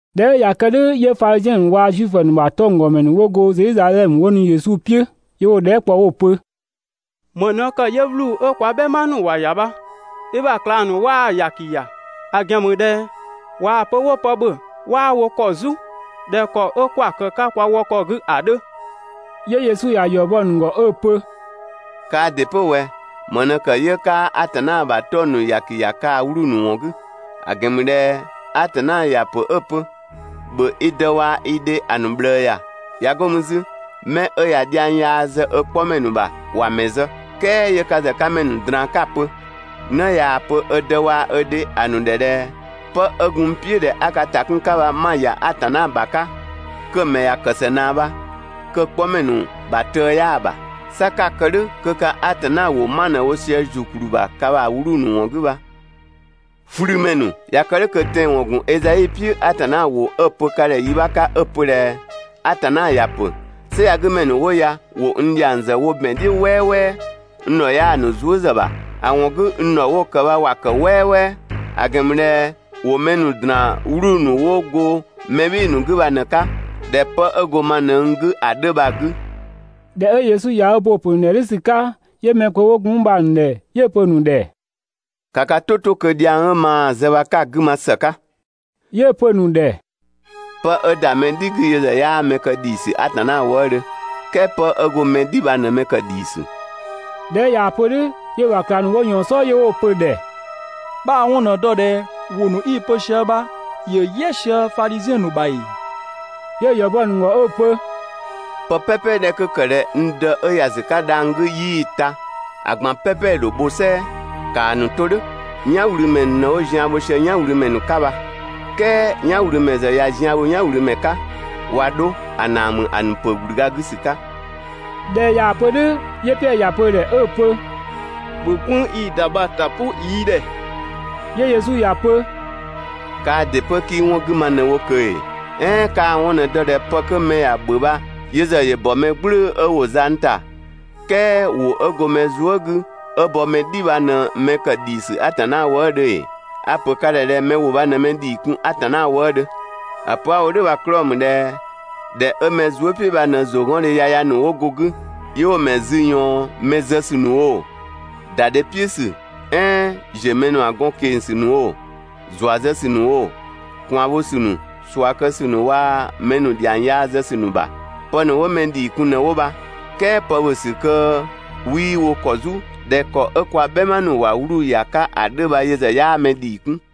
꞊Dhɛ 'ö ꞊ya kë "dhʋ̈ 'yö Fadhiziɛn ‑nu waa‑ Zuifö ‑nu ‑bha 'tɔnggɔmɛ ‑nu 'wo go Zedhizadhɛmö 'wo nu Yesu "piʋ̈, 'yö 'wo‑ dhɛɛ" kpɔ 'wo‑ pö: «‑Më ꞊në ‑kë 'yö 'wluu‑ 'ö kwa "bhɛma ‑nu ‑wa ‑ya bha, i ‑bha ꞊klang ‑nu 'waa‑ ‑yaki ‑ya? ‑A ‑gɛn ‑mü ꞊dhɛ ꞊waa‑ pö 'wo pë ‑bhö 'waa wo ‑kɔ "zu ꞊dhɛ ‑kɔ 'kwa‑ ‑kë 'ka kwa wɔ ‑kɔ 'gü ‑a 'dhö.» 'Yö Yesu ‑ya ‑yɔ bɔ‑ ‑nu ‑gɔ 'ö‑ pö: «Kaa ‑dɩ 'pö ꞊wɛ, ‑më ꞊në ‑kë 'yö 'kaa Atanna ‑bha 'tɔng‑ ‑nu ‑yaki ‑ya ka ‑bha 'wluu‑ ‑nu 'wɔn 'gü? ‑A ‑gɛn ‑mü ꞊dhɛ Atanna ‑ya ‑pö 'ö‑ pö: ‹‑Bhö i dë waa‑ i dhe ‑a ‑nu ꞊bhlëë ‑ya› ꞊ya 'go mü 'zü: ‹'Mɛ 'ö ꞊ya dhiang yaa zë ö 'kpɔmɛ ‑nu ‑bha ‑wa ‑mɛ zë.› "Kɛɛ 'yö ka ‑zë 'ka mɛ ‑nu ꞊draan 'ka‑ pö: ‹'Në ꞊yaa‑ pö ö dë waa‑ ö dhe ‑a ‑nu ‑dhɛ ꞊dhɛ: 'Pë 'ö gun n "piʋ̈ ꞊dhɛ 'a ka ‑ta 'kun‑ 'ka bha 'ma‑ ‑ya Atanna ‑bha 'ka› kö‑ ‑mɛ ‑ya ‑kë ‑së ꞊naa bha, kö‑ 'kpɔmɛ ‑nu ‑bha tëë 'yaa‑ ‑bha. 'Sa 'ka‑ kë "dhʋ̈ kö ka Atanna ‑wʋ 'ma ꞊në 'wo sië ‑zukplü ‑bha kaa‑ 'wluu‑ ‑nu ‑wɔn 'gü bha. ꞊Flümɛ ‑nu! ꞊Ya kë "dhʋ̈ kö tɛanwɔn ‑gun Ezai "piʋ̈ Atanna ‑wʋ 'ö‑ pö ka ‑dhɛ yi 'bha 'ka 'ö‑ pö ꞊dhɛ: ‹Atanna ‑ya ‑pö: "Sɛ ya‑ 'gü ‑mɛ ‑nu 'wo ya ‑wo n ‑dhiang zë wo ‑bɛn "dhiʋ̈ "wɛɛwɛɛ, n ‑dhɔ 'yaa‑ ‑nu zuë" ‑zë ‑bha, ‑a ‑wɔn 'gü n ‑dhɔ 'wo‑ ‑kë bha ‑wa ‑kë "wɛɛwɛɛ; ‑a ‑gɛn ‑mü ꞊dhɛ ‑wo mɛ ‑nu ‑draan 'wluu‑ ‑nu 'wo go mɛ "bhɩɩ‑ ‑nu 'gü bha ꞊në‑ 'ka ꞊dhɛ 'pë 'ö go ma ꞊në n 'gü ‑a 'dhö» bha‑ 'gü.›» ꞊Dhɛ 'ö Yesu ꞊ya ö bo‑ ‑pö ‑nu ‑dhɛ "dhʋ̈ ‑sü 'ka, 'yö mɛ kpö 'wo gun 'mü bha‑ ‑nu ‑dhɛ 'yö‑ pö‑ ‑nu ‑dhɛ: «‑Ka ka "tʋ 'to kö dhiang 'ö maa zë bha 'ka‑ 'gü ma ‑së 'ka!» 'Yö‑ pö‑ ‑nu ‑dhɛ: «'Pë 'ö ‑da mɛ "dhi 'gü yö ‑zë 'yaa mɛ kë ‑dhiisü Atanna wëëdhö, "kɛɛ 'pë 'ö go mɛ "dhi bha ꞊në mɛ ‑kë ‑dhiisü.» ꞊Dhɛ 'ö ꞊yaa‑ pö "dhʋ̈, 'yö‑ ‑bha ꞊klang ‑nu 'wo ꞊yɔɔn‑ "sɔɔ 'yö 'wo‑ pö‑ ‑dhɛ: «'Bhaa‑ 'wɔn ꞊në‑ dɔ ꞊dhɛ ‑wʋ ‑nu 'i‑ pö sië bha ‑yö "yɛ sië Fadhiziɛn ‑nu ‑bha ‑ee?» 'Yö‑ ‑yɔ bɔ‑ ‑nu ‑gɔ 'ö‑ pö: «Pë "pɛpɛ 'dhɛ 'kö ‑kë ꞊dhɛ n Dë 'ö ‑ya ‑sü 'ka dhang‑ 'gü 'yii‑ ta, ‑a ꞊gban "pɛpɛ ‑dho bho "sɛɛ. ‑Kaa ‑nu 'to "dhʋ̈. "Yanwlümɛ ‑nu ꞊në 'wo zian bho sië "yanwlümɛ ‑nu 'ka bha! "Kɛɛ "yanwlümɛ ‑zë ꞊ya zian bho "yanwlümɛ 'ka, ꞊wa 'dho ‑a ‑naa ‑mü ‑a ‑nu ‑pö ‑gblüga 'gü ‑sü 'ka.» ꞊Dhɛ ꞊yaa‑ pö "dhʋ̈, 'yö Piɛdhö ‑ya pö‑ ‑dhɛ 'ö‑ pö: «‑Bhö "gwënng 'i‑ ‑da bha‑ ‑ta "pʋ yi ‑dhɛ!» 'Yö Yesu ‑ya pö: «Kaa ‑dɩ 'pö 'kii 'wɔn 'gü ma ꞊në wo ꞊kö ‑ee? "Ɛɛn 'kaa‑ 'wɔn ꞊në‑ dɔ ꞊dhɛ pë 'kö mɛ ‑ya ‑bhö bha yö ‑zë ‑yö ‑bɔ mɛ "gblʋ̈ʋ̈‑ 'ö ‑wo zang ‑ta, "kɛɛ ‑wʋ 'ö go mɛ zuë" 'gü 'ö bɔ mɛ "dhi bha ꞊në mɛ ‑kë ‑dhiisü Atanna wëëdhö ‑ee? A‑ ‑pö ka ‑dhɛ ꞊dhɛ mɛ ‑wʋ bha ꞊në mɛ ‑dhii kun Atanna wëëdhö. ‑A pö 'a‑ wo "dhʋ̈ bha‑ 'klɔɔ‑ ‑mü ꞊dhɛ ‑dhɛ 'ö mɛ zuë" "piʋ̈ bha ꞊në ‑zʋgɔndhe yaya ‑nu 'wo go‑ 'gü, 'yö 'wo‑ ‑mɛ zü ꞊yɔɔn mɛ zë ‑sü ‑nu oo, ‑da dhe "piʋ̈ ‑sü "ɛɛn ‑ziö mɛ ‑nu ‑bha gɔn ꞊keng‑ ‑sü ‑nu oo, ‑zua zë ‑sü ‑nu oo, ꞊kwaan bho ‑sü ‑nu, ꞊sua kë ‑sü ‑nu waa‑ mɛ ‑nu ‑dhiang yaa zë ‑sü ‑nu ‑bha. Pë ‑nu 'wo mɛ ‑dhii kun ꞊në 'wo bha, "kɛɛ pë ‑bhö ‑sü 'kö kö 'wii wo ‑kɔ "zu ꞊dhɛ ‑kɔ 'ö kwa "bhɛma ‑nu ‑wa 'wluu‑ ‑ya 'ka ‑a 'dhö bha yö ‑zë 'yaa mɛ ‑dhii 'kun.»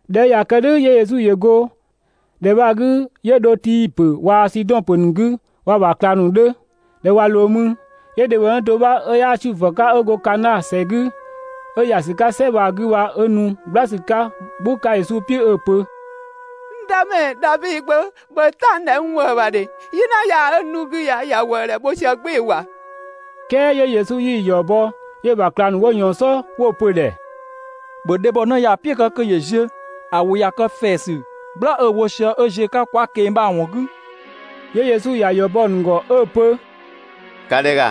꞊Dhɛ 'ö ꞊ya kë "dhʋ̈ 'yö Yesu ‑yö go ‑dhɛ bha‑ 'gü 'yö dho Tii ‑pö waa‑ Sidɔn ‑pö ‑nu 'gü waa‑ ‑bha ꞊klang ‑nu 'dhö. ꞊Dhɛ 'ö ꞊wa ꞊loo mü, 'yö dhebhɔnë do 'bha 'ö 'yaa Zuifö 'ka 'ö go Kanaa ‑sɛ 'gü 'ö ‑ya ‑sü 'ka "sɛ bha‑ 'gü bha 'ö nu "gbla ‑sü 'ka "gbʋ 'ka Yesu "piʋ̈ 'ö‑ pö: «N Dëmɛ, Davi Gbö, ‑bhö "ta n ‑dhɛ n ‑wëë ‑bha ‑dhe! "Yina yaa 'ö n 'dhu 'gü ya ‑ya ‑wëë ‑dhɛ wo sië "gbɩɩ‑ ‑wa!» "Kɛɛ 'yö Yesu 'yii‑ ‑yɔ bɔ, 'yö‑ ‑bha ꞊klang ‑nu 'wo ꞊yɔɔn‑ "sɔɔ 'wo‑ pö‑ ‑dhɛ: «‑Bhö dhebhɔnë ya‑ "piʋ̈ kë kö ‑yö ziö, ‑a ‑wʋ ꞊ya kë ‑fɛɛsü "gbla 'ö‑ wo sië 'ö ‑ziö 'ka kwa ꞊keng‑ bha‑ ‑wɔn 'gü.» 'Yö Yesu ‑ya ‑yɔ bɔ‑ ‑nu ‑gɔ 'ö‑ pö: «‑Ka ‑dhɛ ‑ga,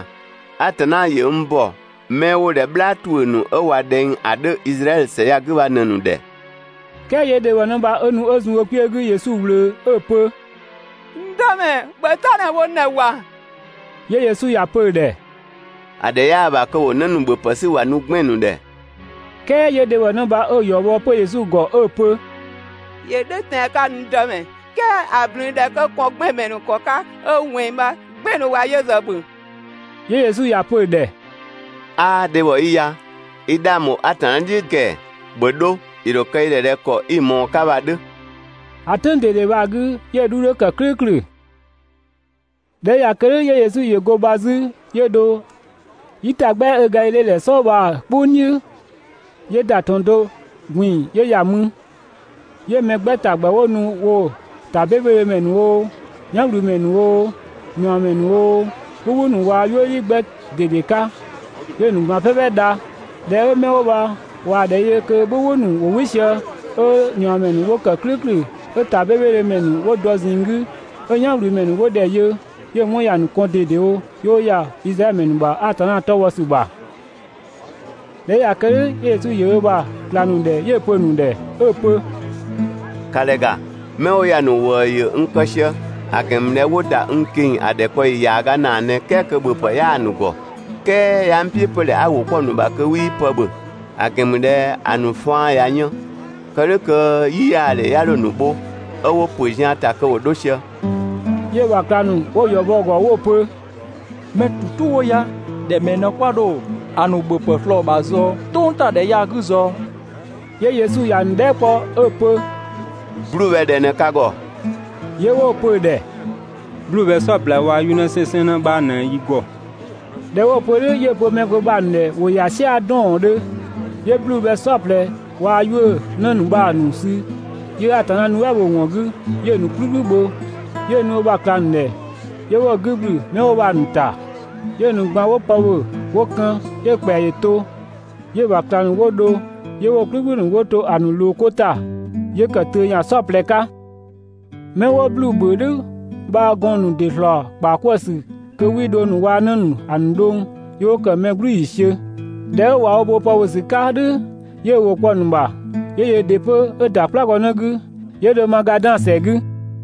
Atanna ‑yö n ‑bɔ 'mɛ 'wo ꞊dhɛ "bhlaa ‑tuʋ̈ ‑nu 'ö ꞊wa ꞊dhɛng ‑a 'dhö Izraɛdhö ‑sɛ ya‑ 'gü bha ꞊në‑ ‑nu ‑dhɛ.» "Kɛɛ 'yö dhebhɔnë bha 'ö nu 'ö zun ö kpiö 'gü Yesu ꞊wlöö 'ö‑ pö: «N Dëmɛ, ‑bhö "ta ꞊në wo n ‑dhɛ ‑wa!» 'Yö Yesu ‑ya pö‑ ‑dhɛ: «‑A ‑dhɛ 'yaa‑ ‑bha kö ‑wo 'në ‑nu ‑bhöpë 'sü ‑wa nu 'gbɛn‑ ‑nu ‑dhɛ.» "Kɛɛ 'yö dhebhɔnë bha 'ö‑ ‑yɔ bɔ 'pö Yesu ‑gɔ 'ö‑ pö: «‑Yö "dhʋ̈ tɛan‑ 'ka, n Dëmɛ, "kɛɛ ‑a ꞊blün 'dhɛ 'kö kɔn 'gbɛn‑ ‑mɛ ‑nu ‑kɔ 'ka 'ö ꞊wɛnng 'gbɛn‑ ‑nu ‑wa yö ‑zë ‑bhö.» 'Yö Yesu ‑ya pö‑ ‑dhɛ: «'Aa dhebhɔ 'i ya! i 'dhang bho Atanna "dhiʋ̈ ꞊dedewo ‑kɛɛ! ‑Bhö 'dho, ‑yö ‑dho kë i ‑dhɛ ꞊dhɛ ‑kɔ 'i‑ ꞊mɔɔ‑ 'ka bha‑ 'dhö!» ‑A "tʋ̈ng ꞊dede bha‑ 'gü, 'yö‑ 'dhu 'dhö ‑kë "klʋ̈ʋ̈klʋ̈. ꞊Dhɛ 'ö ꞊ya kë "dhʋ̈ 'yö Yesu ‑yö go bha 'zü 'yö dho "yitagbɛa 'ö Gadhidhe ‑dhɛ "sɔɔ bha‑ "kpʋng "dhiʋ̈, 'yö ‑da ‑tɔn do ꞊gbin‑ 'yö ‑ya mü. 'Yö ‑mɛ 'gbɛ ‑ta ‑gbɛ 'wo nu‑ "piʋ̈ woo‑ ‑ta 'bebedhö ‑mɛ ‑nu oo, "yanwlümɛ ‑nu oo, ꞊niɔɔmɛ ‑nu oo, "bhʋbhʋ ‑nu waa‑ "yuëdhi 'gbɛ ꞊dede 'ka, 'yö‑ ‑nu ꞊gban "pɛpɛ dha. ꞊Dhɛ 'ö 'mɛ 'wo bha ꞊waa‑ ‑dhɛ yö kö "bhʋbhʋ ‑nu ‑wo "wɩ sië 'ö ꞊niɔɔmɛ ‑nu 'wo ‑kë "klʋ̈ʋ̈klʋ̈ 'ö ‑ta 'bebedhö ‑mɛ ‑nu 'wo dɔ ꞊zinng 'gü, 'ö "yanwlümɛ ‑nu 'wo ‑dhɛ yö, 'yö‑ 'wɔn ‑ya ‑nu kɔn ꞊dedewo, 'yö 'wo ‑ya Izraɛdhö ‑mɛ ‑nu ‑bha Atanna 'tɔ bhɔ ‑sü ‑bha. ꞊Dhɛ 'ö ꞊ya kë "dhʋ̈ 'yö Yesu ‑yö ö ‑bha ꞊klang ‑nu ‑dhɛ 'yö‑ pö‑ ‑nu ‑dhɛ 'ö‑ pö: «‑Ka ‑dhɛ ‑ga! 'Mɛ 'wo ya‑ ‑nu ‑wëë ‑yö n kë sië, ‑a ‑gɛn ‑mü ꞊dhɛ 'wo ‑da n ꞊keng‑ ‑a ‑dhɛkpaɔyi ‑yaaga ‑naa ꞊në "kɛɛ kö ‑bhöpë 'bha 'yaa‑ ‑nu ‑gɔ, "kɛɛ 'yaa n "piʋ̈ 'pö ꞊dhɛ 'a ‑wʋ 'kpɔ‑ ‑nu ‑bha kö 'wii pë 'bha ‑bhö, ‑a ‑gɛn ‑mü ꞊dhɛ ‑a ‑nu faan ‑ya yën, kë "dhʋ̈ kö "yiyaadhe 'ya 'dho‑ ‑nu bho 'ö 'wo ‑pö zian‑ kö ‑wo 'dho sië.» 'Yö‑ ‑bha ꞊klang ‑nu 'wo‑ ‑yɔ bɔ‑ ‑gɔ 'wo‑ pö: «Mɛ ‑tu "tu 'wo ya ‑dhɛ ‑mɛɛ ꞊në 'kwa dho‑ ‑nu ‑bhöpë ꞊slɔɔ‑ ‑bha "tʋngtadhɛ ya‑ 'gü ꞊zɔɔ?» 'Yö Yesu ‑ya ‑nu dhɛɛ" kpɔ 'ö‑ pö: «'Bluu‑ bhɛ ꞊dhɛ ꞊në ka ‑gɔ?» 'Yö 'wo‑ pö‑ ‑dhɛ: «'Bluu‑ bhɛ "saɔplɛ waa‑ 'yuʋ̈‑ 'nësɛnsɛnnë 'bha ꞊në yi ‑gɔ.» ꞊Dhɛ 'wo‑ pö "dhʋ̈ 'yö‑ pö mɛ kpö bha‑ ‑nu ‑dhɛ ‑wo ‑ya "sia‑ 'dɔɔɔndhö. 'Yö 'bluu‑ bhɛ "saɔplɛ waa‑ 'yuʋ̈‑ 'në ‑nu bha‑ ‑nu sü 'yö Atanna nuɛ" bho‑ ‑wɔn 'gü 'yö‑ ‑nu "kplükplü bho, 'yö‑ nu ö ‑bha ꞊klang ‑nu ‑dhɛ 'yö 'wo‑ 'gü ‑gblü 'mɛ 'wo bha‑ ‑nu ‑ta. 'Yö‑ ‑nu ꞊gban 'wo pë ‑bhö 'wo kën. 'Yö‑ ‑kpɛa ‑yö to, 'yö‑ ‑bha ꞊klang ‑nu 'wo dho 'yö 'wo‑ "kplükplü ‑nu 'wo to ‑a ‑nu ꞊loo 'ko ‑ta, 'yö kë töö ‑yan "saɔplɛ 'ka. 'Mɛ 'wo 'bluu‑ ‑bhö "dhʋ̈ bha‑ gɔɔn‑ ‑nu ‑dɩ ‑slɔɔ ‑kpaa 'kwëë‑ ‑sü kö 'wii dhong ‑nu waa‑ 'në ‑nu ‑a ‑nu dhʋng, 'yö 'wo ‑kë mɛ "gblü ‑yiisiö. ꞊Dhɛ 'ö ꞊wa 'wo bo pë ‑bhö ‑sü 'ka "dhʋ̈, 'yö ö ‑wʋ kpɔ‑ ‑nu ‑bha, 'yö yöö ‑dɩ 'pö 'ö ‑da "kplagɔnë 'gü 'yö dho Magadan ‑sɛ 'gü.